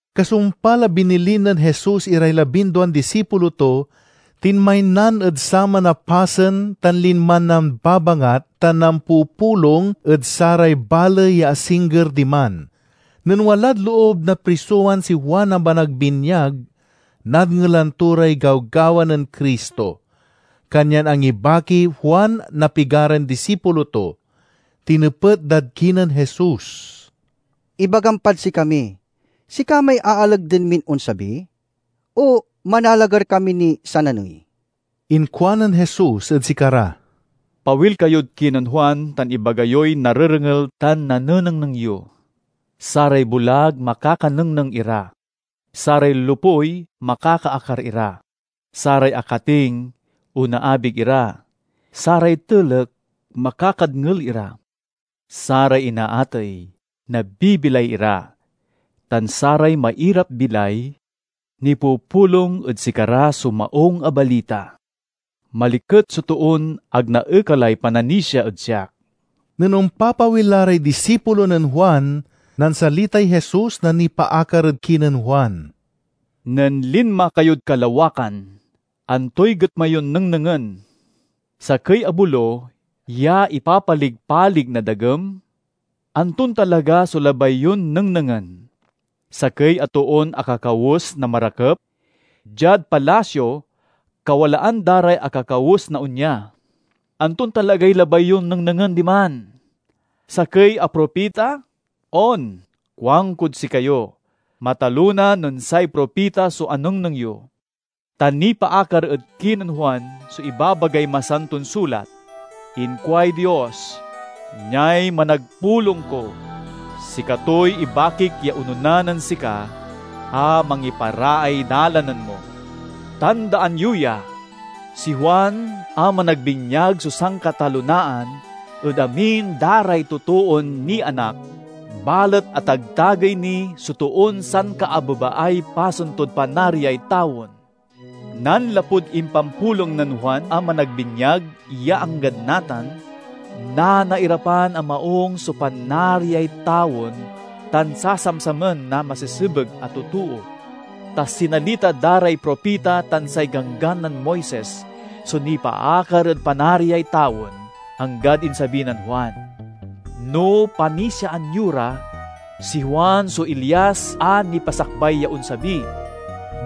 Kasumpal a binilin nen Jesus iray labinduan disipulo to, tinmaynan ed saman a pasen tan linman nambabangat tan nampupulong ed saray baley ya asingger diman. Nen walad loob na prisowan si Juan a Managbinyag, nadngelan to ray gawgawa nen Cristo. Kanyan angibakiy Juan na pigaran disipulo to. Tinepet dad kinen Jesus, "Ibagam pad sikami: sika may aalagden min onsabi o manalagar kami niy sananey?" Inkuanen Jesus ed sikara, "Pawil kayod kinen Juan tan ibaga yoy narerengel tan nanenengneng yo: saray bulag makakanengneng ira, saray lopuy makakaakar ira, saray akating onaabig ira, saray telek mamakadngel ira, saray inaatey nabibilay ira, tan saray mairapbilay nipupulong ed sikara so Maung a Balita. Maliket so toon ag naekalay pananisia ed siak!" Nen ompapawil la ray disipulo nen Juan, nansalitay Jesus na nipaakar ed kinen Juan, "Nen linma kayod kalawakan, antoy getma yon nengnengen? Sakey a bolo ya ipapalig-palig na dagem? Anton talaga so labay yon nengnengen? Sakey a toon akakawes na marakep? Diad palasio kawalaan da ray akakawes na onya. Anton talagay labay yon nengnengen diman? Sakey a propita? On, kuankod sikayo: matalona nen say propita so anengneng yo. Ta nipaakar ed kinen Juan so ibabagay Masanton Sulat: 'Inkuay Dios, Niay managpulong ko; sikatoy ibakik ya onona nen sika a mangiparaay dalanen mo.' Tandaan yo ya! Si Juan a Managbinyag so sankatalonaan ed amin da ray totoon nianak, balet atagtagey ni so toon sankaabebaay pasen tod Panariay tawen. Nanlapud impampulong nen Juan a Managbinyag ya anggad natan, nanairapan a maung so Panariay tawen tan sasamsamen na masesebeg a totoo. Ta sinalita da ray propita tan say Ganggan nen Moises so nipaakar ed Panariay tawen, anggad insabi nen Juan. No panisiaan yo ra, si Juan so Elias a nipasakbay ya onsabi.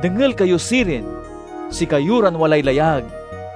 Dengel kayo sirin, sikayo ran walay layag!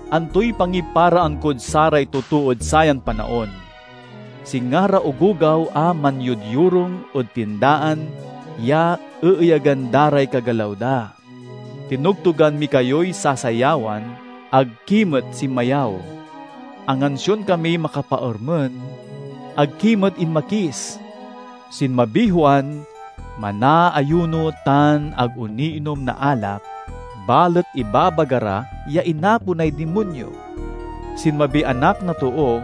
"Antoy pangiparaan kod saray totood sayan panaon? Singa ra ogogaw a manyodyorung ed tindaan ya eeyagan da ray kagalaw da, 'Tinogtogan mi kayoy sasayawan, ag ki met sinmayaw; angansion kamiy makapaermen, ag ki met inmakis!' Sinmabiy Juan, manaayuno tan ag oniinom na alak, balet ibabaga ra ya inaponay dimonyo. Sinmabiy Anak na Too,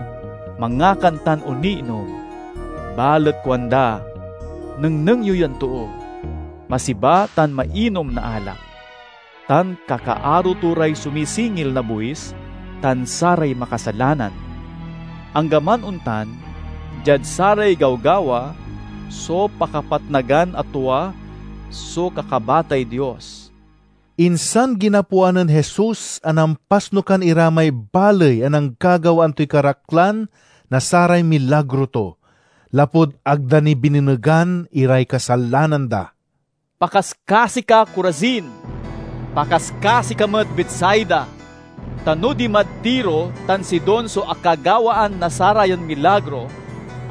mangakan tan oniinom, balet kuanda, 'Nengneng yo yan too! Masiba tan mainom na alak, tan kakaaro to ray sumisingil na buis tan saray makasalanan!' Anggaman ontan, diad saray gawgawa so pakapatnagan a tua so kakabatay Dios." Insan ginapoan nen Jesus a nampasnukan ira may baley a nanggagawaan toy karaklan na saray milagro to, lapud ag da ni binenegan iray kasalanan da. "Pakaskasi ka, Corazin! Pakaskasi ka met, Betsaida! Ta no dimad Tiro tan Sidon so akagawaan na sarayan milagro,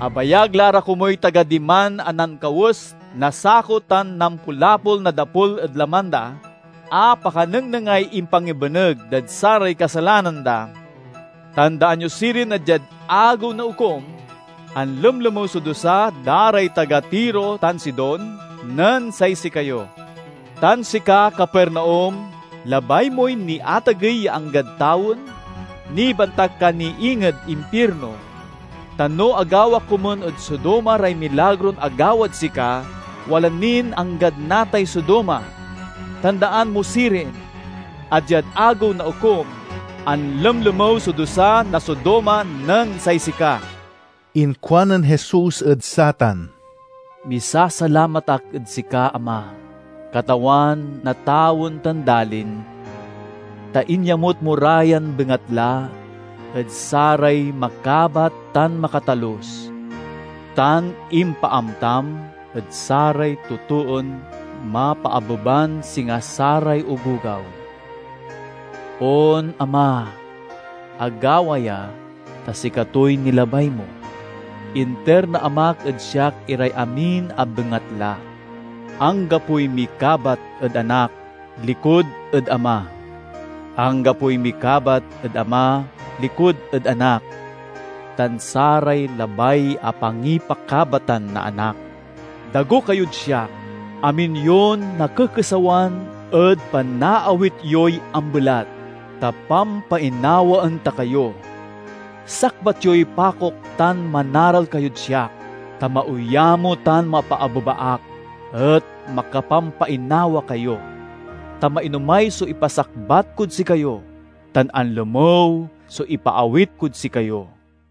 abayag la ra komuy taga diman a nankawes na sako tan nampulapol na dapul ed laman da, a pakanengnengay impangibeneg dad saray kasalanan da! Tandaan yo sirin a diad Agew na Okum, anlemlemew so dusa da ray taga Tiro tan Sidon nen say sikayo! Tan sika, Capernaum, labay moy niatagey ya anggad tawen? Nibantak ka ni inged impirno! Ta no agawa komun ed Sodoma ray milagron agawad sika, wala nin anggad natay Sodoma! Tandaan mo sirin, a diad Agew na Okum, anlemlemew so dusa na Sodoma nen say sika!" Inkuanen Jesus ed satan, "Misasalamat ak ed sika, Ama, Katawan na tawen tan dalin, ta inyamut mo ra yan bengatla ed saray makabat tan makatalus, tan impaamtam ed saray totoon mapaabeban singa saray ogogaw. On, Ama, agawa ya ta sikatoy nilabay mo. "Inter na Amak ed siak iray amin a bengatla. Anggapoy mikabat ed Anak likud ed Ama; anggapoy mikabat ed Ama likud ed Anak tan saray labay a pangipakabatan na Anak. "Dago kayod siak, amin yon nakekesawan ed panaawit yoy ambelat, ta pampainawaen ta kayo. Sakbat yoy pakok tan manaral kayod siak, ta mauyamo tan mapaabeba ak, et makapampainawa kayo. Ta mainomay so ipasakbat kod sikayo, tan anlemew so ipaawit kod sikayo."